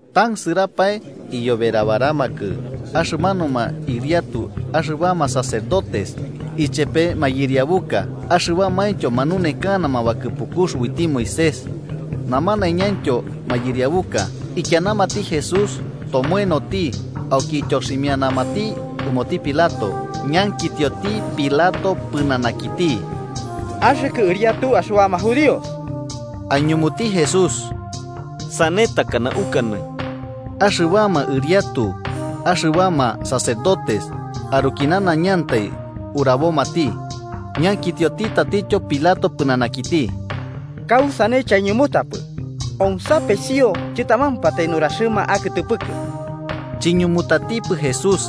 Tansɨrapae, iyoberabaramakɨ axɨmanuma ɨriatu axɨbama sacerdotes ichepe mayɨriabuka axɨbamaintyo manunekanama bakɨpukux uiti Moisés, namanaiñantyo mayɨriabuka. Ikianamati Jesús tomoenoti, auki ityoximianamati ɨmoti Pilato. Ñankitioti Pilato pɨnanakiti: –¿Axɨkɨ Ɨriatu axɨbama judíos? –Aiñumuti Jesús–sane takana ukanɨ. Axɨbama ɨriatu axɨbama sacerdotes aruki nanaiñantai urabomati, ñankitioti tatityo Pilato pɨnanakiti: –¿Kausane chaiñumutapɨ? Omsapesio chɨtamampatai nuraxɨma akɨtɨpɨkɨ. Chiñumutatipɨ Jesús.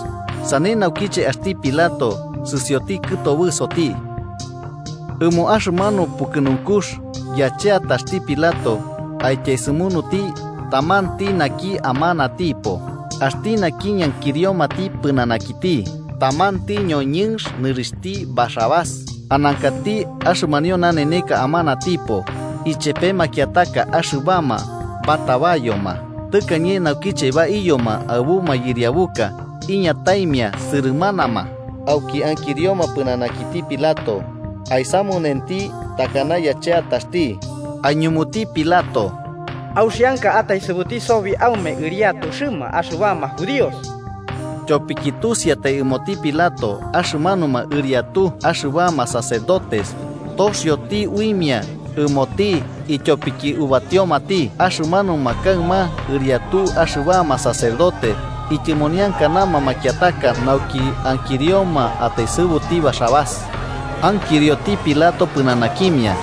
Sane naukiche axti Pilato sɨsioti kɨtobɨsoti. Ɨmo axɨmanu pukɨnunkux, yacheataxti Pilato aityaesɨmunuti tamanti naki amanatipo, Axti naki ñankiriomati pɨnanakiti. Tamanti ñoñɨnx nɨrixhti Barrabás, anankati axɨmanio naneka amanatipo, ichepe makiataka axɨbama batabayoma tɨkañe naukiche baiyoma aɨbu mayɨriabuka. Iñataimia sɨrɨmanama, auki ankirioma pɨnanakiti Pilato aisamunenti takana yacheataxti. Aiñumuti Pilato: –¿Auxianka ataesɨbuti sobi aume Ɨriatuxɨma axɨbama judíos? Tyopiki tusiatai ɨmoti Pilato axɨmanuma ɨriatu axɨbama sacerdotes toxioti uimia ɨmoti ityopiki ubatiomati. Axɨmanuma kaɨma ɨriatu axɨbama sacerdote ityɨmoniankanama makiataka, nauki ankirioma ataesɨbuti Barrabás. Ankirioti Pilato pɨnanakimia: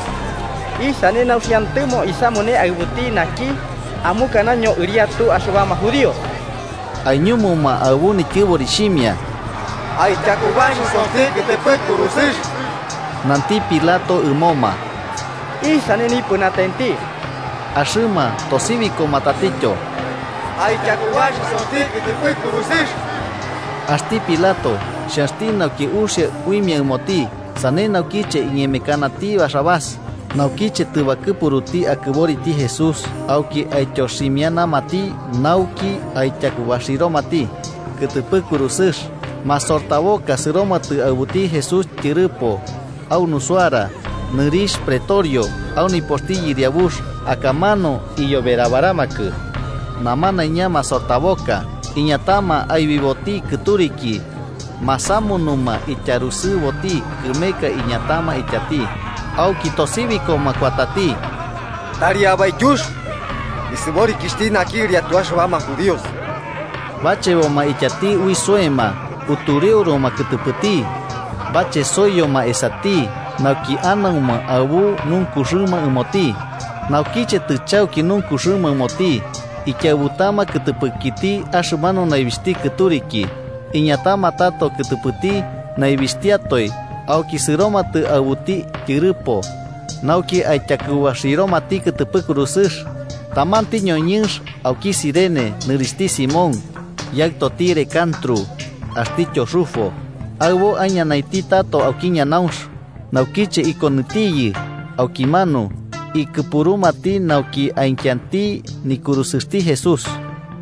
–¿Isane nauxiantɨmo isamune aɨbuti naki amukanaño Ɨriatu axɨbama judíos? Aiñumuma aɨbu nityosibixhimia: –¡Aityakubaxisoti kɨtɨpɨ kurusɨx! Nanti Pilato ɨmoma: –¿Isane nipɨnatenti? Axɨma tosibikoma tatityo: –¡Aityakubaxisoti kɨtɨpɨ kurusɨx! Axti Pilato, xhanxti nauki uxia uimia ɨmoti, sane naukiche iñemekanati Barrabás. Naukiche tɨbakɨpuruti akɨboriti Jesús, auki aityoximianati nauki aityakubaxiromati kɨtɨpɨ kurusɨx. Masortaboka sɨromatɨ aɨbuti Jesús tyɨrɨpo au nusuara, nɨrixh pretorio au nipoxti yɨriabux, akamanu iyoberabaramakɨ namanaiña masortaboka. Iñatama aibiboti kɨturiki, masamunuma ityarusɨboti kɨmeka iñatama ityati. Auki tosibikoma kuatati: –¡Tari abaityux nisɨborikixhti naki Ɨriatu axɨbama judíos! Bacheboma ityati ui soema, utureuruma kɨtɨpɨti, bachesoiyoma esati nauki anauma aɨbu nunkuxɨma ɨmoti. Naukiche tɨchauki nunkuxɨma ɨmoti, ikiaɨbutama ikɨtɨpɨkiti axɨmanu naibixhti kɨturiki, iñatama tato kɨtɨpɨti naibixtiatoe auki sɨromatɨ aɨbuti tyɨrɨpo, nauki aityakubaxiromati kɨtɨpɨ kurusɨx. Tamanti ñoñɨnx auki Cirene, nɨrixhti Simón, yaɨtoti Alejandro axtityo Rufo, aɨbo aiñanainti tato auki ñanaunx. Naukiche ikonɨtiyɨ aukimanu, ikɨpurumati nauki aikianti nikurusɨxti Jesús.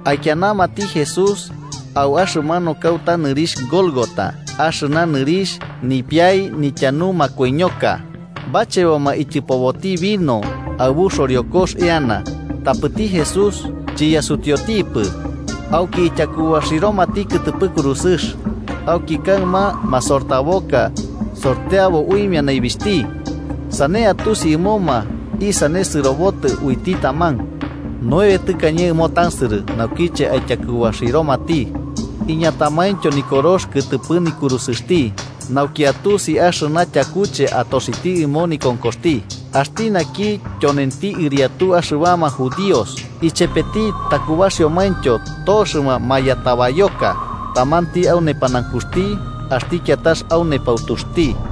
Aikianamati Jesús au axɨmanu kauta nɨrixh Gólgota, (axɨna nɨrixh: “Nipiai nityanu makoiñoka.”) Bacheboma ityɨpoboti vino aɨbu xoriokox eana, tapɨti Jesús chiyasutiutipɨ. Auki ityakubaxiromati kɨtɨpɨ kurusɨx. Auki kaɨma masortaboka sorteabo uimia naibixhti, sane atusi ɨmoma isane sɨrobotɨ uiti taman. Nueve tɨkañe ɨmo tansɨrɨ naukiche aityakubaxiromati. Iñatamaintyo nikorox kɨtɨpɨ nikurusɨxti, nauki atusi axɨna tyakuche atoxiti ɨmo nikonkoxti: “Axti naki tyonenti Ɨriatu axɨbama judíos.” Ichepeti takubaxiomaintyo toxɨma mayatabayoka, tamanti au nepanaunkuxti axti kiatax au nepautuxti.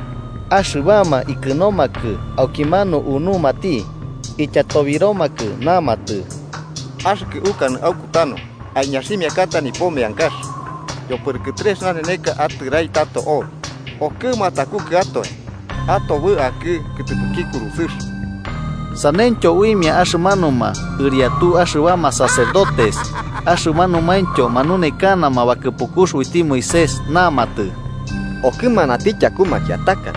Axɨbama ikɨnomakɨ aukimanu unumati, ityatobiromakɨ namatɨ: –¡Axɨkɨ, ukanɨ aukutanu aiñaximiakata nipo meankax yopɨrɨkɨ trex naneneka atɨrai tato obi, okɨma atakukɨatoe atobɨ akɨ kɨtɨpɨki kurusɨx! Saneityo uimia axɨmanuma ɨriatu axɨbama sacerdotes axɨmanumaintyo manunekana bakɨpukux uiti Moisés. Namatɨ: –Okɨmanati tyaku makiataka,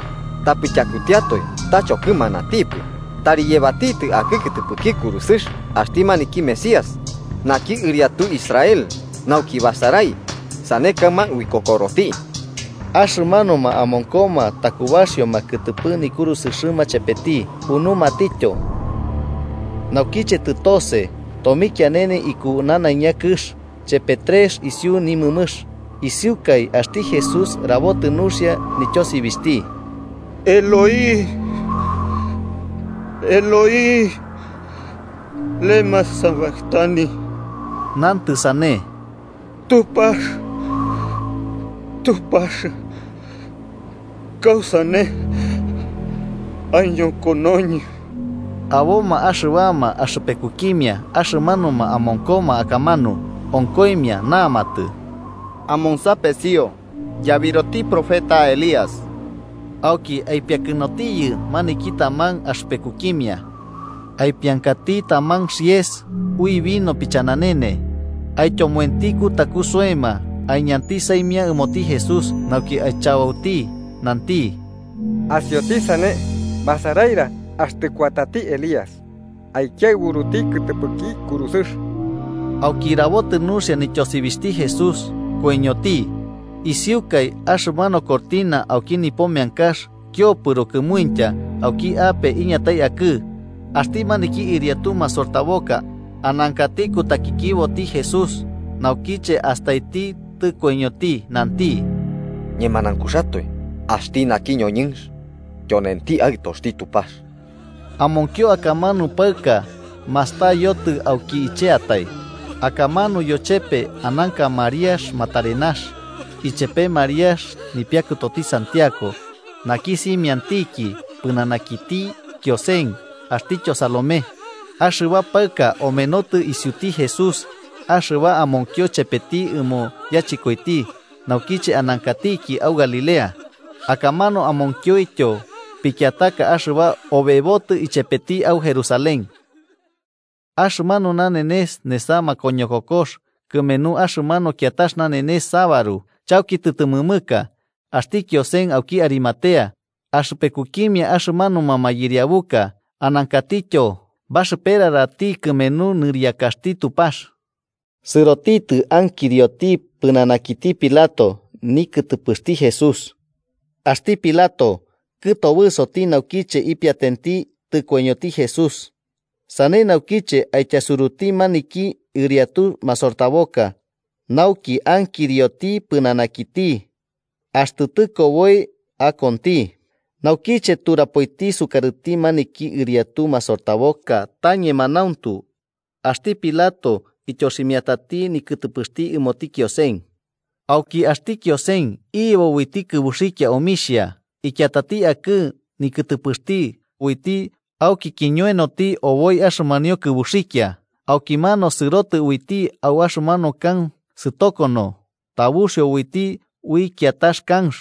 tapɨ tyakutiatoe ta chokɨmanatipɨ. ¡Tari yebatitɨ akɨ kɨtɨpɨki kurusɨx axti maniki Mesías, naki Ɨriatu Israel, nauki basarai, sane kaɨma uikokoroti! Axɨmanuma amonkoma takubaxioma kɨtɨpɨ nikurusɨxɨma chepeti unumatityo. Naukiche tɨtose, tomikianene iku nanaiña kɨx chepe trex isiu nimɨmɨx. Isiukai axti Jesús rabotɨ nuxia nityosibixhti: “Eloí, Eloí, ¿lemá sabactani?” (nantɨ sane: “Tupax, Tupax, ¿kausane aiñokonoñɨ?”) Aboma axɨbama axɨpekukimia axɨmanuma amonkoma akamanu, onkoimia namatɨ: –Amonsapesio, yabiroti profeta Elías. Auki aipiakɨnotiyɨ maniki taman axɨpekukimia, aipiankati taman xɨrɨpɨtɨx ui vino pichananene, aityomoenti kutaku soema aiñanti saimia ɨmoti Jesús nauki aichabauti, nanti: –Asioti sane, basaraira axtɨ kuatati Elías aikiaɨburuti kɨtɨpɨki kurusɨx. Auki rabotɨ nuxia nityosibixhti Jesús, koiñoti. Isiukai axɨmanu cortina au nipo meankax kiopɨro kɨmuintya auki ape iñatai akɨ. Axti maniki ɨriatu masortaboka, anankati kutakikiboti Jesús, naukiche astaiti tɨkoiñoti, nanti: –Ñemanaunkuxatoe Axti naki ñoñɨnx tyonenti Aɨtoxti Tupax. Amonkio akamanu paɨka mastayotɨ auki icheatai. Akamanu yochepe ananka Mariax Magdalena, ichepe Mariax nipiakɨtoti Santiago naki simiantiki pɨnanakiti Kiosen axtityo Salomé. Axɨba paɨka omenotɨ isiuti Jesús axɨba amonkio chepeti ɨmo yachɨkoiti naukiche anankatiki au Galilea. Akamanu amonkioityo pikiataka axɨba obebotɨ ichepeti au Jerusalén. Axɨmanu nanenes nesa makoñokokox, kɨmenu axɨmanu kiatax nanenes sabaru, chauki tɨtɨmɨmɨka. Axti Kiosen, auki Arimatea, axɨpekukimia axɨmanuma mayɨriabuka, anankatityo baxɨperarati kɨmenu nɨriakaxti Tupax, sɨrotitɨ ankirioti pɨnanakiti Pilato nikɨtɨpɨxti Jesús. Axti Pilato, kɨtobɨsoti naukiche ipiatenti tɨkoiñoti Jesús, sane naukiche aityasuruti maniki ɨriatu masortaboka nauki ankirioti pɨnanakiti axtɨ tɨkoboi akonti. Naukiche turapoiti sukarɨti maniki ɨriatu masortaboka ta ñemanauntu, axti Pilato ityoximiatati nikɨtɨpɨxti ɨmoti Kiosen. Auki axti Kiosen iyebo uiti kɨbuxikia omixhia, ikiatati akɨ nikɨtɨpɨxti uiti auki kiñoenoti oboi axɨmanio kɨbuxikia. Aukimanu sɨroti uiti au axɨmanu kanx sɨtokono tabuxio uiti ui kiatax kanx.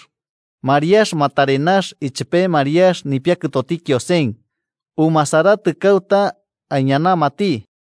Mariax Magdalena ichepe Mariax nipiakɨtoti Kiosen, umasaratɨ kauta aiñanamati.